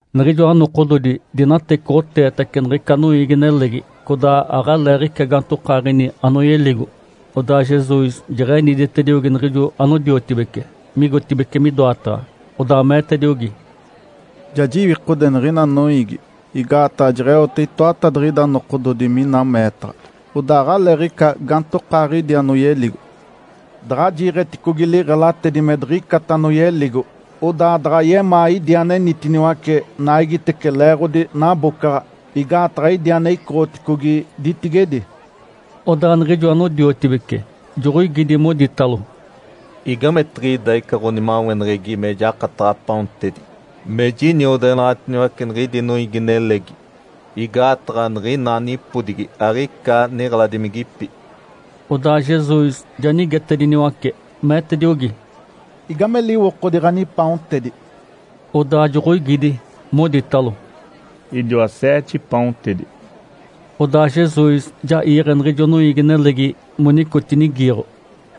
Niɡ̶ijoa nokododi dinatecoɡ̶oteetace niɡ̶ica noiigi-nelegi, codaa aɡ̶aleeɡ̶ica gaantokaaɡ̶ini anoyeligo. Odaa Jesus jeɡ̶eniditediogi niɡ̶ijo anodiotibece migotibeci midoataɡ̶a, odaa meetediogi, “Ja jiwikode niɡ̶ina noiigi, igaataɡ̶a jeɡ̶eote itoatadiɡ̶ida nokododi mina meetaɡ̶a, odaa aɡ̶aleeɡ̶ica gaantokaaɡ̶idi anoyeligo. Daɡ̶a jiiɡ̶eticogi liɡ̶elatedi me diɡ̶icata anoyeligo, odaa daɡ̶a yemaa idi anenitiniwace naigitece leeɡ̶odi nabocaɡ̶a, igaataɡ̶a idi ane icoɡ̶oticogi ditigedi.” Odaa niɡ̶ijo anodiotibece joɡ̶oigidi, moditalo, “Igamigetiɡ̶ida ica ɡ̶onimaweneɡ̶egi me jakataɡ̶a paontedi me jiniodeɡ̶enaɡ̶atiniwace niɡ̶idi noiigi-nelegi? Igaataɡ̶a niɡ̶ina nipodigi aɡ̶ica niɡ̶eladimigipi.” Odaa Jesus ja nigetediniwace, meetediogi, “Igame liwokodi ɡ̶anipaontedi?” Odaa joɡ̶oigidi, moditalo, “Idiwa seete paontedi.” Odaa Jesus ja iiɡ̶e niɡ̶ijo noiigi-nelegi monicotinigiiɡ̶o.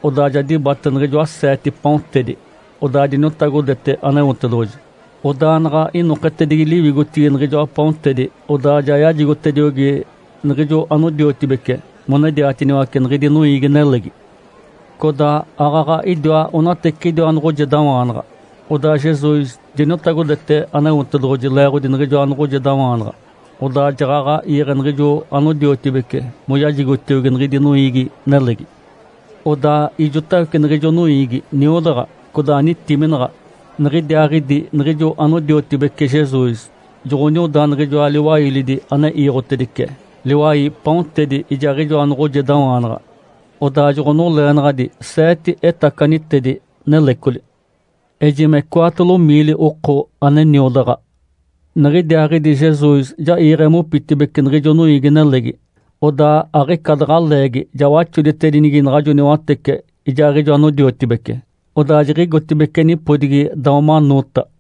Odaa ja dibate niɡ̶ijoa seete paontedi, odaa diniotagodete Aneotedoɡ̶oji. Odaa naɡ̶a inoketedigi liwigotigi niɡ̶ijoa paontedi, odaa ja yajigotediogi niɡ̶ijo anodiotibece monediatiniwace niɡ̶idi noiigi-nelegi. Codaa aaɡ̶aɡ̶a idiwa onateciɡ̶idiwa noɡ̶ojedawaanaɡ̶a. Odaa Jesus diniotagodete Aneotedoɡ̶oji leeɡ̶odi niɡ̶ijoa noɡ̶ojedawaanaɡ̶a, odaa jaɡ̶aɡ̶a iiɡ̶e niɡ̶ijo anodiotibece moyajigotiogi niɡ̶idi noiigi-nelegi. Odaa ijotawece niɡ̶ijo noiigi niodaɡ̶a, codaa nitiminaɡ̶a. Niɡ̶idiaaɡ̶idi niɡ̶ijo anodiotibece Jesus joɡ̶onioda niɡ̶ijoa liwailidi ane iiɡ̶otedice liwai paontedi ijaaɡ̶ijoa noɡ̶ojedawaanaɡ̶a, odaa joɡ̶onoleenaɡ̶adi seete etacanitedi nelecoli. Ejime cwaatolo miili oko ane niodaɡ̶a. Niɡ̶idiaaɡ̶idi Jesus ja iiɡ̶e mopitibeci niɡ̶ijo noiigi-nelegi, odaa aɡ̶ica daɡ̶a leegi ja waxoditedinigi naɡ̶ajo niwatece ijaaɡ̶ijo anodiotibece, odaa jiɡ̶igotibeci nipodigi Dalmanuta.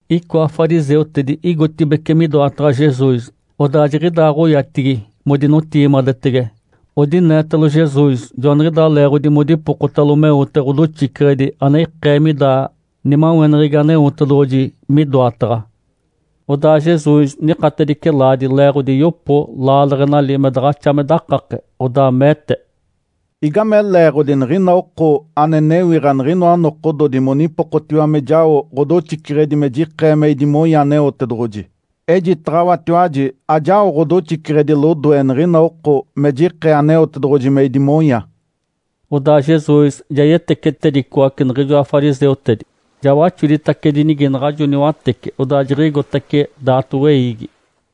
Icoa fariseutedi igotibeci midoataɡ̶a Jesus, odaa jiɡ̶idaaɡ̶oyatigi modinotigimadetege. Odineetalo Jesus, joaniɡ̶idaa leeɡ̶odi modipokotalo meote ɡ̶odoxiceɡ̶edi ane ikee mida nimaweneɡ̶egi Aneotedoɡ̶oji midoataɡ̶a. Odaa Jesus nikatedice laadi leeɡ̶odi yopo laaleɡ̶enali me daɡ̶axa me dakake, odaa meete, “Igame leeɡ̶odi niɡ̶ina oko ane newiɡ̶a niɡ̶inoa nokododi monipokotiwa me jao ɡ̶odoxiceɡ̶edi me jikee me idimonya Aneotedoɡ̶oji? Ejitaɡ̶awatiwaji ajao ɡ̶odoxiceɡ̶edi lodoe niɡ̶ina oko me jikee Aneotedoɡ̶oji me idimonya.” Odaa Jesus ja yetecetedicoace niɡ̶ijoa fariseutedi. Ja waxoditacedinigi naɡ̶ajo niwatece, odaa jiɡ̶igotace daato weiigi.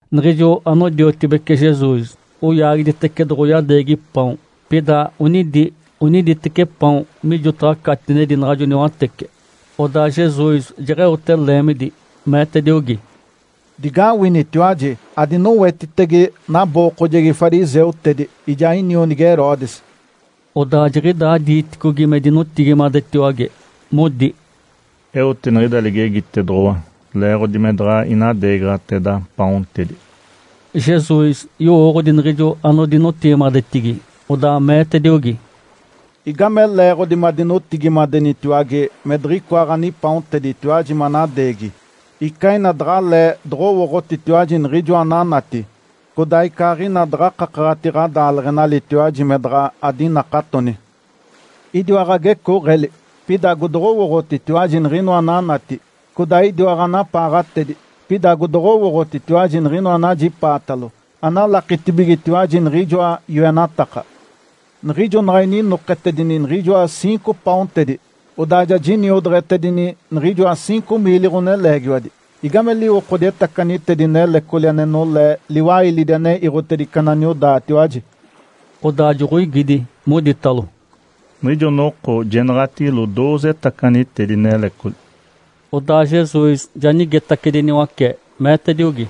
Niɡ̶ijo anodiotibece Jesus oyaagiditece doɡ̶oyadeegi paon. Pida onidi oniditeci paon mijotaɡ̶a catinedi naɡ̶ajo niwatece. Odaa Jesus jeɡ̶eote leemidi, meetediogi, “Digawinitiwaji! Adinowetitege nabookojegi fariseutedi ijaa inionigi Herodes!” Odaa jiɡ̶idaa diiticogi me dinotigimadetiwage, modi, “Eote niɡ̶ida ligegitedoɡ̶owa leeɡ̶odi me daɡ̶a inadeegaɡ̶ateda paontedi.” Jesus yowooɡ̶odi niɡ̶ijo anodinotigimadetigi, odaa meetediogi, “Igame leeɡ̶odi madinotigimadenitiwage me diɡ̶icoa ɡ̶anipaonteditiwaji manadeegi? Icaaɡ̶ina daɡ̶alee doɡ̶owooɡ̶otitiwaji niɡ̶ijoa ananati. Codaa icaaɡ̶ina daɡ̶a akakaɡ̶ati ɡ̶adaaleɡ̶enalitiwaji me daɡ̶a adinakatoni. Idiwa ɡ̶agecooɡ̶eli, pida agodoɡ̶owooɡ̶otitiwaji niɡ̶inoa ananati. Codaa idiwa ɡ̶anapaaɡ̶atedi, pida agodoɡ̶owooɡ̶otitiwaji niɡ̶inoa anajipaatalo. Aɡ̶analakitibigetiwaji niɡ̶ijoa yoenataka. Niɡ̶ijo naɡ̶a ininoketedini niɡ̶ijoa ciinco paontedi, odaa ja jiniodeɡ̶etedini niɡ̶ijoa ciinco miili ɡ̶oneleegiwadi, igame liwokodi etacanitedi nelecoli ane nolee liwailidi ane iiɡ̶otedice ananiodaatiwaji?” Odaa joɡ̶oigidi, moditalo, “Niɡ̶ijo noko jenaɡ̶atigilo dooze etacanitedi nelecoli.” Odaa Jesus ja nigetacediniwace, meetediogi,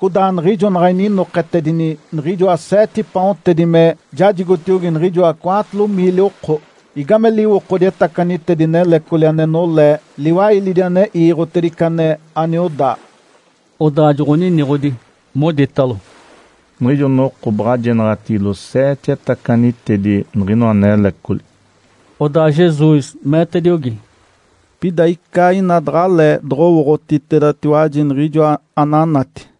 “Codaa niɡ̶ijo naɡ̶a ininoketedini niɡ̶ijoa seete paontedi me jajigotiogi niɡ̶ijoa cwaatolo miili oko, igame liwokodi etacanitedi nelecoli ane nolee liwailidi ane iiɡ̶otedice ane aniodaa?” Odaa joɡ̶oniniɡ̶odi, moditalo, “Niɡ̶ijo noko baɡ̶a jenaɡ̶atigilo seete etacanitedi niɡ̶inoa nelecoli.” Odaa Jesus meetediogi, “Pida ica ina daɡ̶alee doɡ̶owooɡ̶otitedatiwaji niɡ̶ijoa ananati.”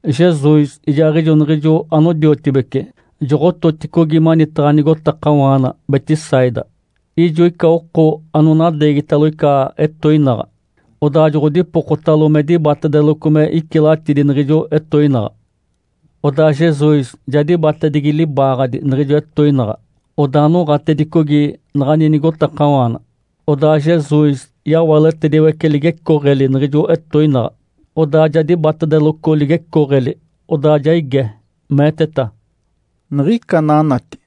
Jesus ijaaɡ̶ijo niɡ̶ijo anodiotibece joɡ̶ototicogi manitaɡ̶a nigotakawaana Betsaida. Ijo ica oko anonadeegitalo ica etoinaɡ̶a, odaa joɡ̶odipokotalo me dibatedeloco me icilatidi niɡ̶ijo etoinaɡ̶a. Odaa Jesus ja dibatedigi libaaɡ̶adi niɡ̶ijo etoinaɡ̶a, odaa noɡ̶atedicogi naɡ̶ani nigotakawaana. Odaa Jesus yawaletediwece ligecooɡ̶eli niɡ̶ijo etoinaɡ̶a, odaa ja dibatedeloco ligecooɡ̶eli, odaa ja ige, meeteta, “Niɡ̶ica ananati?”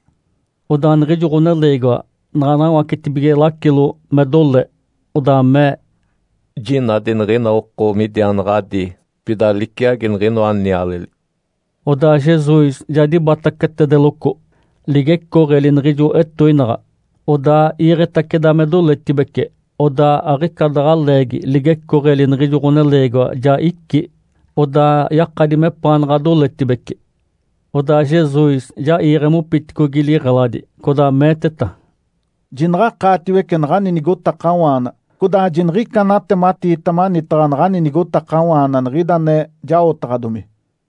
Odaa niɡ̶ijo ɡ̶oneleegiwa naɡ̶a nawacetibige lacilo me dole, odaa mee, “Jinadi niɡ̶ina oko midiaanaɡ̶adi, pida liciagi niɡ̶inoa nialeli.” Odaa Jesus ja dibatacetedeloco ligecooɡ̶eli niɡ̶ijo etoinaɡ̶a, odaa iiɡ̶etaceda me doletibece. Odaa aɡ̶ica daɡ̶a leegi ligecooɡ̶eli niɡ̶ijo ɡ̶oneleegiwa ja icí, odaa yakadi mepaanaɡ̶a doletibece. Odaa Jesus ja iiɡ̶e mopiticogi liɡ̶eladi, codaa meeteta, “Jinaɡ̶akaatiwece naɡ̶ani nigotakawaana, codaa jiniɡ̶ica anatematiita manitaɡ̶a naɡ̶ani nigotakawaana niɡ̶ida ane jaotaɡ̶adomi.”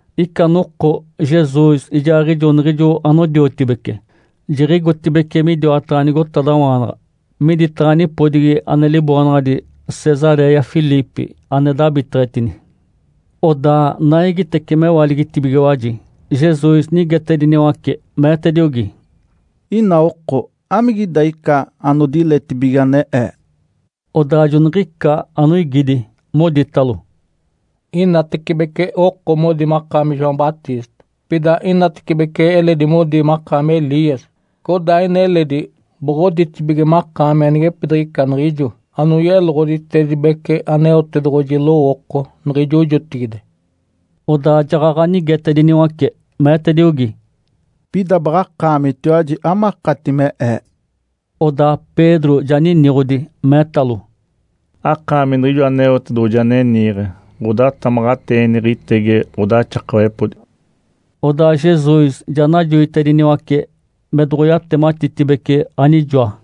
Ica noko Jesus ijaaɡ̶ijo niɡ̶ijo anodiotibece jiɡ̶igotibeci midiwataɡ̶a nigotadawaanaɡ̶a miditaɡ̶a nipodigi ane liboonaɡ̶adi “Cesaréia Filipe ane dabiteɡ̶etini”. Odaa naigitece mewaligitibigiwaji, Jesus nigetediniwace, meetediogi, “Ina oko, amigida ica anodiletibige ane Ee?” Odaa joniɡ̶ica anoigidi, moditalo, “Inatecibece oko modi makaami João Batista, pida inatecibece eledi modi makaami Elias, codaa ina eledi boɡ̶oditibige makaami anigepidiɡ̶ica niɡ̶ijo anoyeloɡ̶oditedibece Aneotedoɡ̶oji lowooko niɡ̶ijo jotigide.” Odaa jaɡ̶aɡ̶a nigetediniwace, meetediogi, “Pida baɡ̶akaamitiwaji, amakati me Ee?” Odaa Pedro ja niniɡ̶odi, meetalo, “Akaami Niɡ̶ijo Aneotedoɡ̶oji ane niiɡ̶e ɡ̶odatamaɡ̶ateeneɡ̶egitege ɡ̶odaxakawepodi.” Odaa Jesus ja najoitediniwace me doɡ̶oyatematitibece anijoa.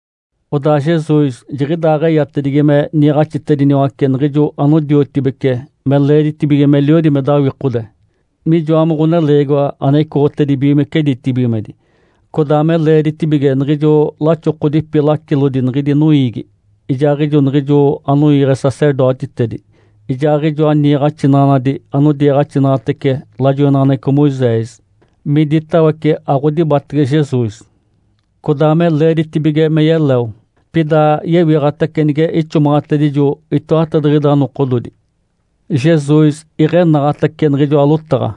Odaa Jesus jiɡ̶idaaɡ̶eyatedigi me niiɡ̶axitediniwace niɡ̶ijo anodiotibece me leeditibige meliodi me dawikode, mijoa me Ǥoneleegiwa ane icoɡ̶otedibigimece ditibigimedi. Codaa me leeditibige niɡ̶ijo laxokodipi lacilodi niɡ̶idi noiigi, ijaaɡ̶ijo niɡ̶ijo anoiiɡ̶e sacerdotitedi, ijaaɡ̶ijoa niiɡ̶axinaɡ̶anadi anodiiɡ̶axinaɡ̶atece lajoinaɡ̶aneɡ̶eco Moisés, miditawece aɡ̶odibatege Jesus. Codaa me leeditibige me yeleo, pida yewiɡ̶atace nige ixomaɡ̶atedijo itoatadiɡ̶ida nokododi. Jesus iɡ̶enaɡ̶atece niɡ̶ijoa lotaɡ̶a.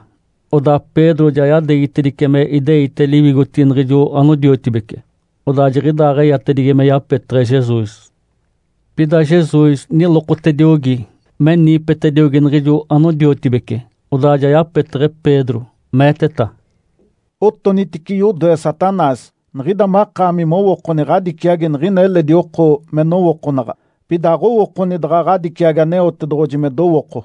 Odaa Pedro ja yadeegitedice me ideite liwigotigi niɡ̶ijo anodiotibece, odaa jiɡ̶idaaɡ̶eyatigi me yapeteɡ̶e Jesus. Pida Jesus nilokotediogi, me niipetediogi niɡ̶ijo anodiotibece, odaa ja yapeteɡ̶e Pedro, meeteta, “Otonitice yodoe, Satanás! Niɡ̶ida makaami mowookoni ɡ̶adiciagi niɡ̶ina eledi oko me nowookonaɡ̶a, pida aɡ̶owookoni daɡ̶a ɡ̶adiciagi Aneotedoɡ̶oji me dowooko.”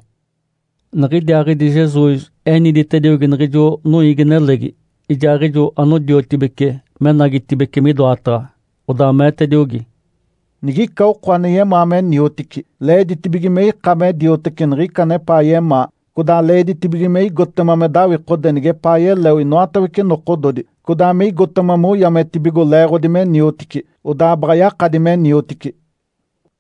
Niɡ̶idiaaɡ̶idi Jesus eniditediogi niɡ̶ijo noiigi-nelegi ijaaɡ̶ijo anodiotibece me enagitibeci midoataɡ̶a. Odaa meetediogi, “Nigica oko ane yemaa me niotici, leeditibige me ika me dioteci niɡ̶ica anepaa yemaa, codaa leeditibige me igotema me dawikode nigepaa yeleo inoatawece nokododi, codaa me igotema moyametibigo leeɡ̶odi me niotici, odaa baɡ̶a yakadi me niotici.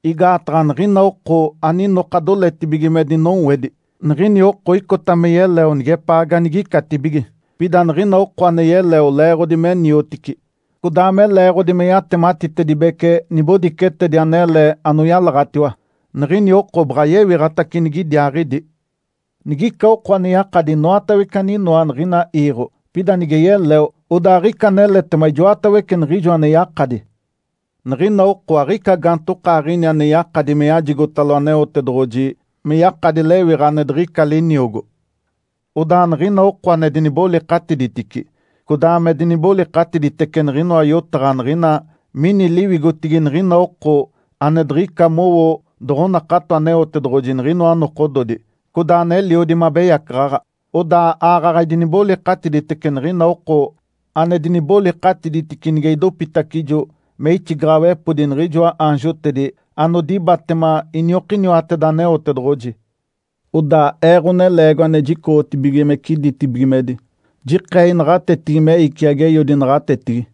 Igaataɡ̶a niɡ̶ina oko aninoka doletibige me dinowedi, niɡ̶ini oko icota me yeleo nigepaa ganigicatibige. Pida niɡ̶ina oko ane yeleo leeɡ̶odi me niotici, codaa me leeɡ̶odi me yatematitedibece nibodicetedi anele anoyalaɡ̶atiwa, niɡ̶ini oko baɡ̶a yewiɡ̶atace nigidiaaɡ̶idi. Nigica oko ane yakadi inoatawece aninoa niɡ̶ina iiɡ̶o, pida nige yeleo, odaa aɡ̶ica aneletema ijoatawece niɡ̶ijo ane yakadi. Niɡ̶ina oko aɡ̶ica gaantokaaɡ̶ini ane yakadi me yajigotalo Aneotedoɡ̶oji me yakadi lewiɡ̶a ane diɡ̶ica liniogo. Odaa niɡ̶ina oko ane dinibolikatiditici, codaa me dinibolikatiditece niɡ̶inoa yotaɡ̶a niɡ̶ina mini liwigotigi niɡ̶ina oko ane diɡ̶ika mowo doɡ̶onakato Aneotedoɡ̶oji niɡ̶inoa nokododi, codaa aneliodi me abeyacaɡ̶aɡ̶a, odaa aaɡ̶aɡ̶a idinibolikatiditece niɡ̶ina oko ane dinibolikatiditici nige idopitacijo me ixigaɡ̶awepodi niɡ̶ijoa aanjotedi anodibatema iniokiniwateda Aneotedoɡ̶oji. Odaa Ee, Ǥoneleegiwa ane jicoɡ̶otibigimece ditibigimedi, jikee inaɡ̶atetigi me iciagi Eiodi naɡ̶atetigi.”